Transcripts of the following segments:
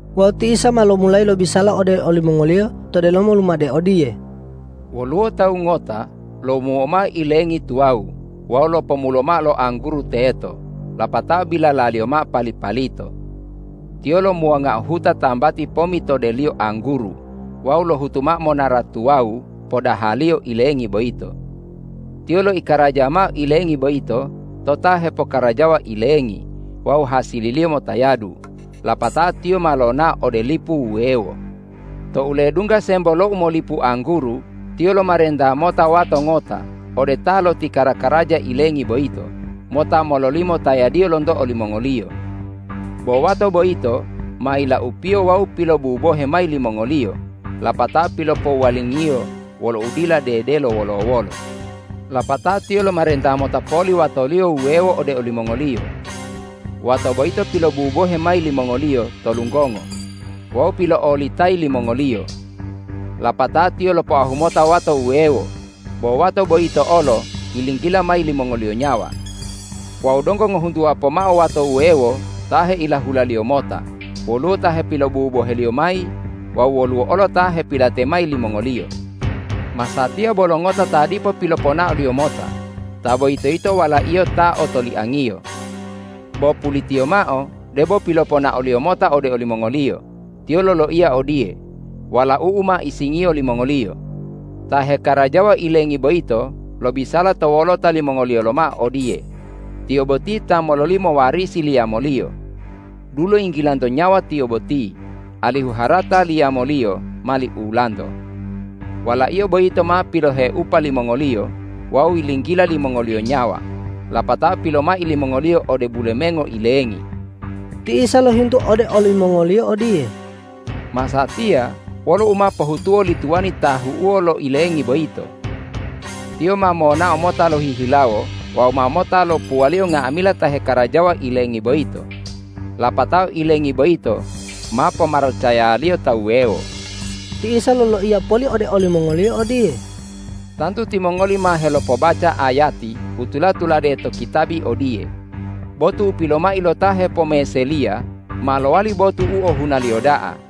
Wawu ti Isa ma lomulayi lobisala ode olimongoliyo to delomo lumade odiye,”Woluwo tawu ngota lomuo mao ilengi tuwawu wawu lopomulo mao lo angguru teto lapatao bilalaliyo mao pali-palito. Tiyo lomuwangao huta tambati pomitodeliyo angguru wawu lohutu mao monara tuwawu podahaliyo ilengi boyito. Tiyo loikaraja mao ilengi boyito to ta hepokkarajawa ilengi wawu hasililiyo motayadu, lapatao tiyo ma lonao ode lipu wuwewo. Tou ledungga sembo lo umolipu angguru, tiyo lomarenta mota wato ngota ode ta loti kara-karaja ilengi boyito mota mololimo tayadiyo lonto olimongoliyo. Bo wato boyito ma yilaupiyo wawu pilobubohe mayi limongoliyo lapatao pilopowuwalingiyo wolo udila dedelo wolo-wolo. Lapatao tiyo lomarenta mota poli watoliyo wuwewo ode olimongoliyo. Wato boyito pilobubohe mayi limongoliyo to lunggongo wawu pilo'olitayi limongoliyo. Lapatao tiyo lopoahu mota wato wuwewo. Bo wato boyito olo yilinggila mayi limongoliyo nyawa. Wawu donggo ngohuntuwa pomao wato wuwewo ta heilahulaliyo mota, woluwo ta hepilobuboheliyo mayi wawu woluwo olo ta hepilate mayi limongoliyo. Masatiya bolo ngota ta dipo piloponaoliyo mota, ta boyito yito walaiyo ta otoliangiyo. Bo pulitiyo mao debo piloponaoliyo mota ode olimongoliyo, tiyo loloiya odiye, ’Walau'u ma isingiyo limongoliyo.’ Ta hekarajawa ilengi boyito lobisala to wolota limongoliyo lomao odiye, ’Tiyo boti ta mololimo warisi liyamoliyo. Dulo yinggilanto nyawa tiyo boti, alihu harata liyamoliyo mali ulanto.’ Walaiyo boyito ma piloheupa limongoliyo wawu yilinggila limongoliyo nyawa lapatao pilomai limongoliyo ode bulemengo ilengi.” Ti Isa lohintu ode olimongoliyo odiye,”Masatiya wolo u ma pohutuwo li tuwani ta ahu'uwo lo ilengi boyito? Tiyo ma monao mota lohihilawo wawu ma mota lopuwaliyo nga'amila ta hekarajawa ilengi boyito, lapatao ilengi boyito ma pomaracayaliyo ta wuwewo.” Ti Isa loloiya poli ode olimongoliyo odiye,”Tantu timongoli ma helopobaca ayati u tula-tulade to kitabi odiye, ’Botu u pilomai lo ta hepomeseliya ma lowali botu u ohunaliyo da'a.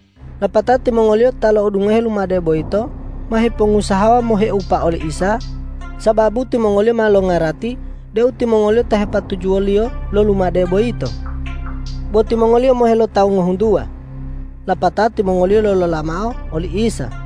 Lapatao timongoliyo ta lo'odungoheo lumade boyito ma hipongusahawa moheupa oli Isa, sababu timongoliyo ma longarati deu timongoliyo ta hepatujuwo-Liyo lo lumade boyito. Bo timongoliyo mohe lo tawu ngohuntuwa. Lapatao timongoliyo lolola mao oli Isa.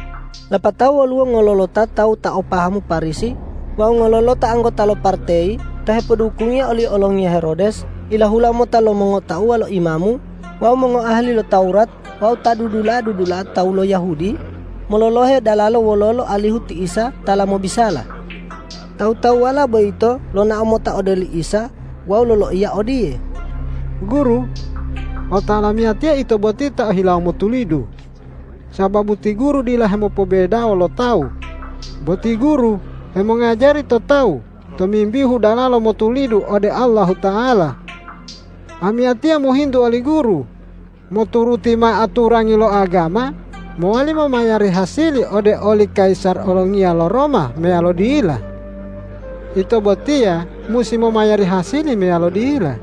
Lapatao woluwo ngololota tawu ta o pahamu Parisi wawu ngololota anggota lo parteyi ta hepodukungiya oli olongiya Herodes ilahula mota lo mongotauwa lo imamu wawu mongoahali lo Tawurat wawu ta dudula'a-dudula'a tawu lo Yahudi, mololohe dalalo wololo alihu ti Isa tala mobisala. Tawu-tawuwala boyito lonao mota ode li Isa wawu loloiya odiye,”Guru, otawa lamiyatiya Ito boti ta o hilawo motulidu, sababu ti Guru dila hemopobedawo lo tawu, bo ti Guru hemongajari to tawu tomimbihu dalala motulidu ode Allahuta'ala. Amiyatiya mohintu oli Guru: Moturuti mao aturangi lo agama, mowali momayari hasili ode oli kayisar olongiya lo Roma meyalo dila? Ito botiya musi momayari hasili meyalo dila?”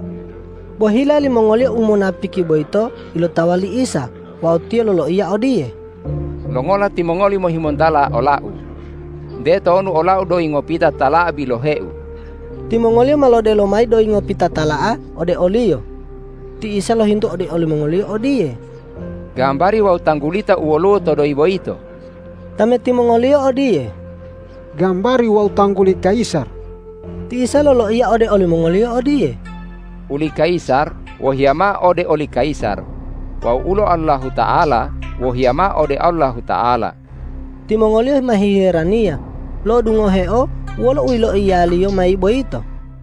Bo hila limongoliyo u munapiki boyito ilotawa li Isa wawu Tiyo loloiya odiye,”Longola timongoli mohimontala ola-U? Nte tonu ola-U doyi ngopita tala'a bilohe-U!” Timongoliyo ma lodelo mayi doyi ngopita tala'a ode o-Liyo. Ti Isa lohintu ode olimongoliyo odiye,”Gambari wawu tanggulita u woluwo to doyi boyito?” Tameti mongoliyo odiye,”Gambari wawu tangguli kayisar.” Ti Isa loloiya ode olimongoliyo odiye,”Uli kayisar wohiya mao ode oli kayisar wawu ulo Allahuta'ala wohiya mao ode Allahuta'ala.” Timongoliyo ma hiheraniya lo'odungoheo wolo u yiloiya-Liyo mayi boyito.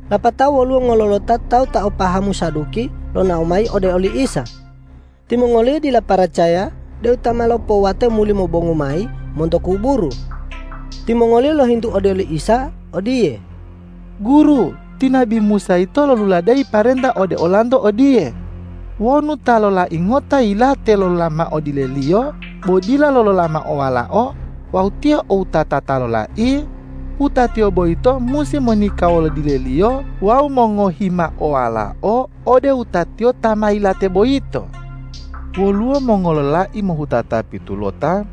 Lapatao woluwo ngololota tawu ta o pahamu Saduki lonao mayi ode oli Isa. Timongoliyo dila paracaya deu ta ma lopowate muli mobongu mayi monto kuburu. Timongoliyo lohintu ode li Isa odiye, ”Guru, ti nabi Musa yito loluladeyi parenta ode olanto odiye, ’Wonu ta lolai ngota yilate lolola mao dileliyo bo dila lolola mao walao wawu tiyo o wutata ta lolai, wutatiyo boyito musi monika wolo dileliyo wawu mongohi mao walao ode wutatiyo ta ma yilate boyito.’ Woluwo mongololai mohutata pitulota.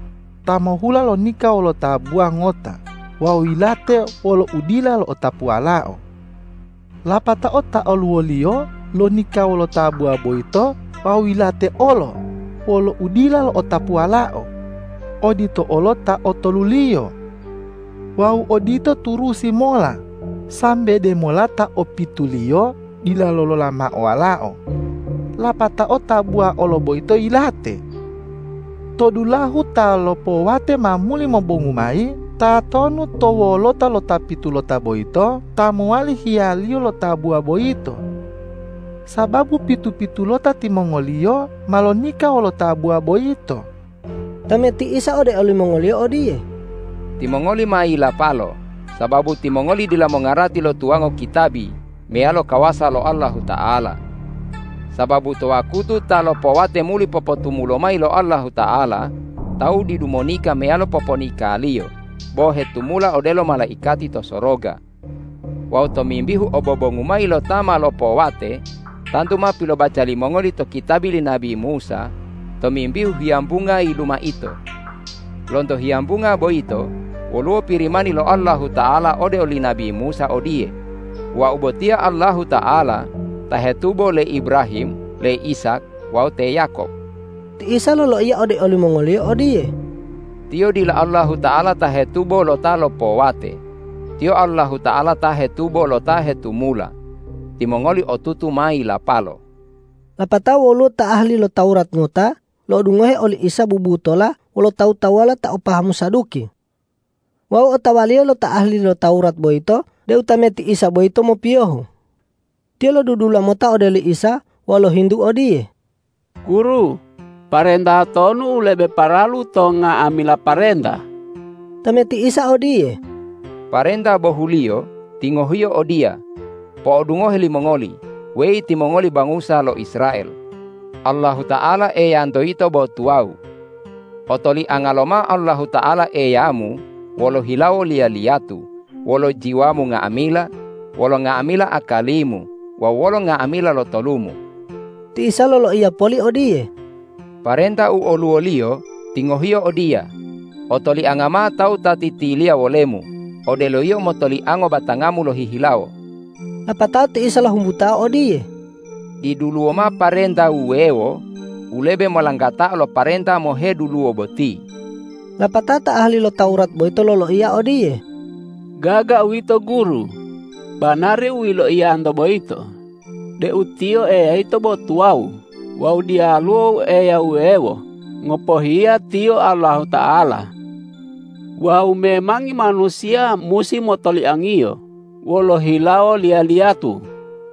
Ta mohuhula lonika wolo tabuwa ngota wawu yilate wolo udila lo'otapu walao. Lapatao ta oluwoliyo lonika wolo tabuwa boyito wawu yilate olo wolo udila lo'otapu walao. Odito olo ta otoluliyo. Wawu odito turusi mola sambe demola ta opituliyo dila lolola mao walao. Lapatao tabuwa olo boyito yilate. To dulahu ta lopowate ma muli mobongu mayi, tatonu to wolota lo ta pitulota boyito ta mowali hiyaliyo lo tabuwa boyito? Sababu pitu-pitulota timongoliyo ma lonika wolo tabuwa boyito.” Tameti Isa ode limongoliyo odiye,”Timongoli ma yilapalo, sababu timongoli dila mongarati lo tuwango kitabi meyalo kawasa lo Allahuta'ala. Sababu to wakutu ta lopowate muli popotumulo mayi lo Allahuta'ala, tawu didu monika meyalo poponikaliyo, bo hetumula odelo malaikati to soroga. Wawu tomimbihu obobongu mayi lo ta ma lopowate, tantu ma pilobaca limongoli to kitabi li nabi Musa tomimbihu hiyambunga yilumaito. Lonto hiyambunga boyito woluwo Pirimani lo Allahuta'ala ode oli nabi Musa odiye, ’Wau botiya Allahuta'ala ta hetubo le Ibrahim, le Ishak wawu te Yakob.’” Ti Isa loloiya ode olimongoliyo odiye,”Tiyo dila Allahuta'ala ta hetubo lo ta lopowate, Tiyo Allahuta'ala ta hetubo lo ta hetumula. Timongoli otutu ma yilapalo.” Lapatao woluwo ta ahali lo Tawurat ngota lo'odungohe oli Isa bubutola wolo tawu-tawuwala ta o pahamu Saduki. Wawu otawaliyo lo ta ahali lo Tawurat boyito deu tameti Isa boyito mopiyohu. Tiyo lodudula mota ode oli Isa wawu lohintu odiye,”Guru, parenta tonu u lebe paralu to nga'amila parenta?” Tameti Isa odiye,”Parenta bohuliyo tingohiyo odiya, ’Po'odungohe limongoli, weyi timongoli bangusa lo Israel! Allahuta'ala Eyanto yito bo tuwawu. Otolianga lomao Allahuta'ala Eyamu wolo hilawo liya-liyatu, wolo jiwamu nga'amila, wolo nga'amila akalimu wawu wolo nga'amila lotolumu.’” Ti Isa loloiya poli odiye,”Parenta u oluwoliyo tingohiyo odiya, ’Otolianga mao tawu ta titiliya wolemu odelo yio motoliango batangamu lohihilawo.’” Lapatao ti Isa lohumbutao odiye,”Diduluwo mao parenta wuwewo u lebe molanggatao lo parenta moheduluwo boti.” Lapatao ta ahali lo Tawurat boyito loloiya odiye,”Gaga uwito Guru, banari u yiloiyanto boyito deu Tiyo Eya yito bo tuwawu wawu diyaluwo Eya wuwewo ngopohiya Tiyo Allahuta'ala. Wawu memangi manusiya musi motoliang-Iyo wolo hilawo liya-liyatu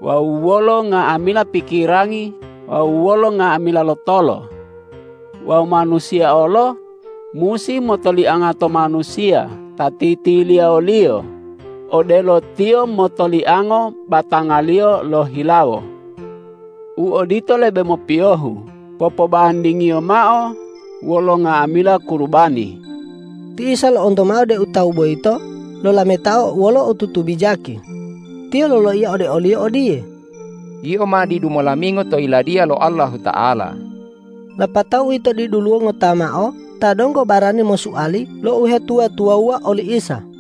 wawu wolo nga'amila pikirangi wawu wolo nga'amila lotolo. Wawu manusiya olo musi motolianga to manusiya ta titiliya woliyo odelo tiyo motoliango batangaliyo lohihilawo. U odito lebe mopiyohu popobandingiyo mao wolo nga'amila kurubani.” Ti Isa lo'onto mao deu tawu boyito lolametao wolo otutu bijaki. Tiyo loloiya ode oliyo odiye,”Yio ma didu molamingo to Yiladiya lo Allahuta'ala!” Lapato uwito diduluwo ngota mao ta donggo barani mosuali lo uhetuwa-tuwawuwa oli Isa.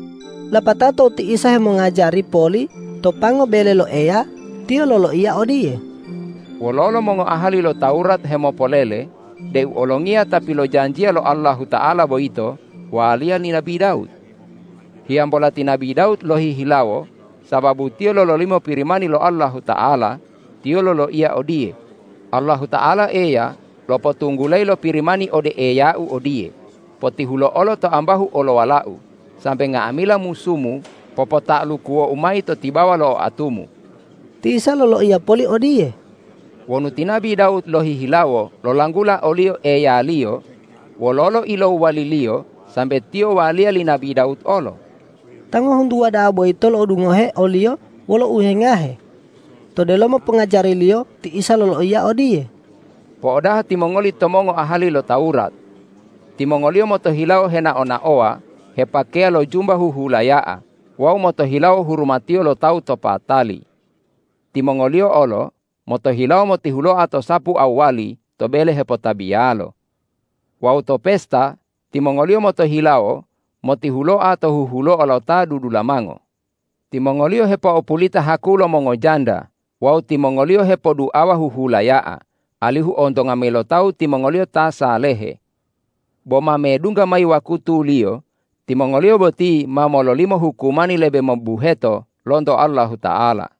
Lapatao tou ti Isa hemongajari poli to pango bele lo Eya, Tiyo loloiya odiye,”Wololo mongoahali lo Tawurat hemopolele deu Olongiya ta pilojanjiya lo Allahuta'ala boyito waliya li nabi Dawud? Hiyambola ti nabi Dawud lohihilawo sababu tiyo lololimo Pirimani lo Allahuta'ala, tiyo loloiya odiye, ’Allahuta'ala Eya lopotunggulayi lo Pirimani ode Eyau odiye: Potihulo'olo to ambahu olowala-U sambe nga'amila musu-Mu popota'alukuwo-U mayi to tibawa lo oatu-Mu.’” (a) Ti Isa loloiya poli odiye,”Wonu ti nabi Dawud lohihilawo lolanggula o-Liyo Eyaliyo, wololo ilowwaliliyo sambe Tiyo waliya li nabi Dawud olo?” (b) Ta ngohuntuwa da'a boyito lodungohe o-Liyo wolo uhewengahe. To delomo pongajari-Liyo ti Isa loloiya odiye,”Po'odaha timongoli to mongoahali lo Tawurat. Timongoliyo motohilawo henao-naowa hepakeya lo jumba huhulaya'a wawu motohilawo hurumatiyo lo tawu to patali. Timongoliyo olo motohilawo motihuloa to sapu awwali to bele hepotabiyalo. Wawu to pesta timongoliyo motohilawo motihuloa to huhuloa lo ta dudulamango. Timongoliyo hepo'opulita haku lo mongojanda wawu timongoliyo hepoduawa huhulaya'a, alihu ontonga mayi lo tawu timongoliyo ta salehe. Bo ma medungga mayi wakutuliyo timongoliyo boti ma mololimo hukumani lebe mobubuheto lonto Allahuta'ala.”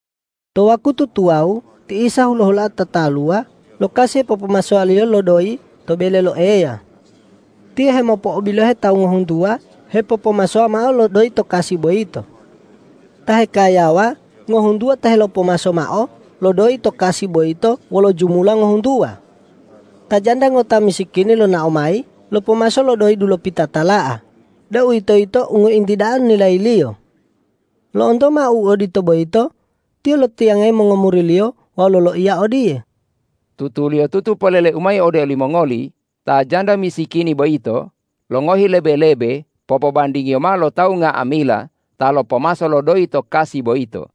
To wakutu tuwawu ti Isa hulo-huloa tataluwa lo kasi hepopomasowaliyo lo doyi to bele lo Eya. Tiyo hemopo'obilohe tawu ngohuntuwa hepopomasowa mao lo doyi to kasi boyito. Ta hekayawa ngohuntuwa ta helopomaso mao lo doyi to kasi boyito wolo jumula ngohuntuwa. Ta janda ngota misikini lonao mayi lopomaso lo doyi dulopita tala'a, deuwitoyito u ngointi da'a nilayiliyo. Lo'onto mao u odito boyito, Tiyo lotiyangayi mongomuri-Liyo wawu loloiya odiye,”Tutuliyotutu polele-U mayi ode olimongoli: Ta janda misikini boyito longohi lebe-lebe popobandingiyo mao lo tawu nga'amila ta lopomaso mao lo doyi to kasi boyito.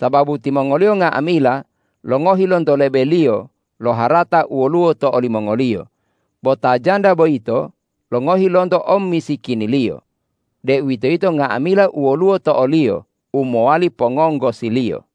Sababu timongoliyo nga'amila longohi lonto lebeliyo lo harata u woluwo to olimongoliyo, bo ta janda boyito longohi lonto omisikiniliyo, deuwitoyito nga'amila u woluwo to oliyo u mowali pongonggosiliyo.”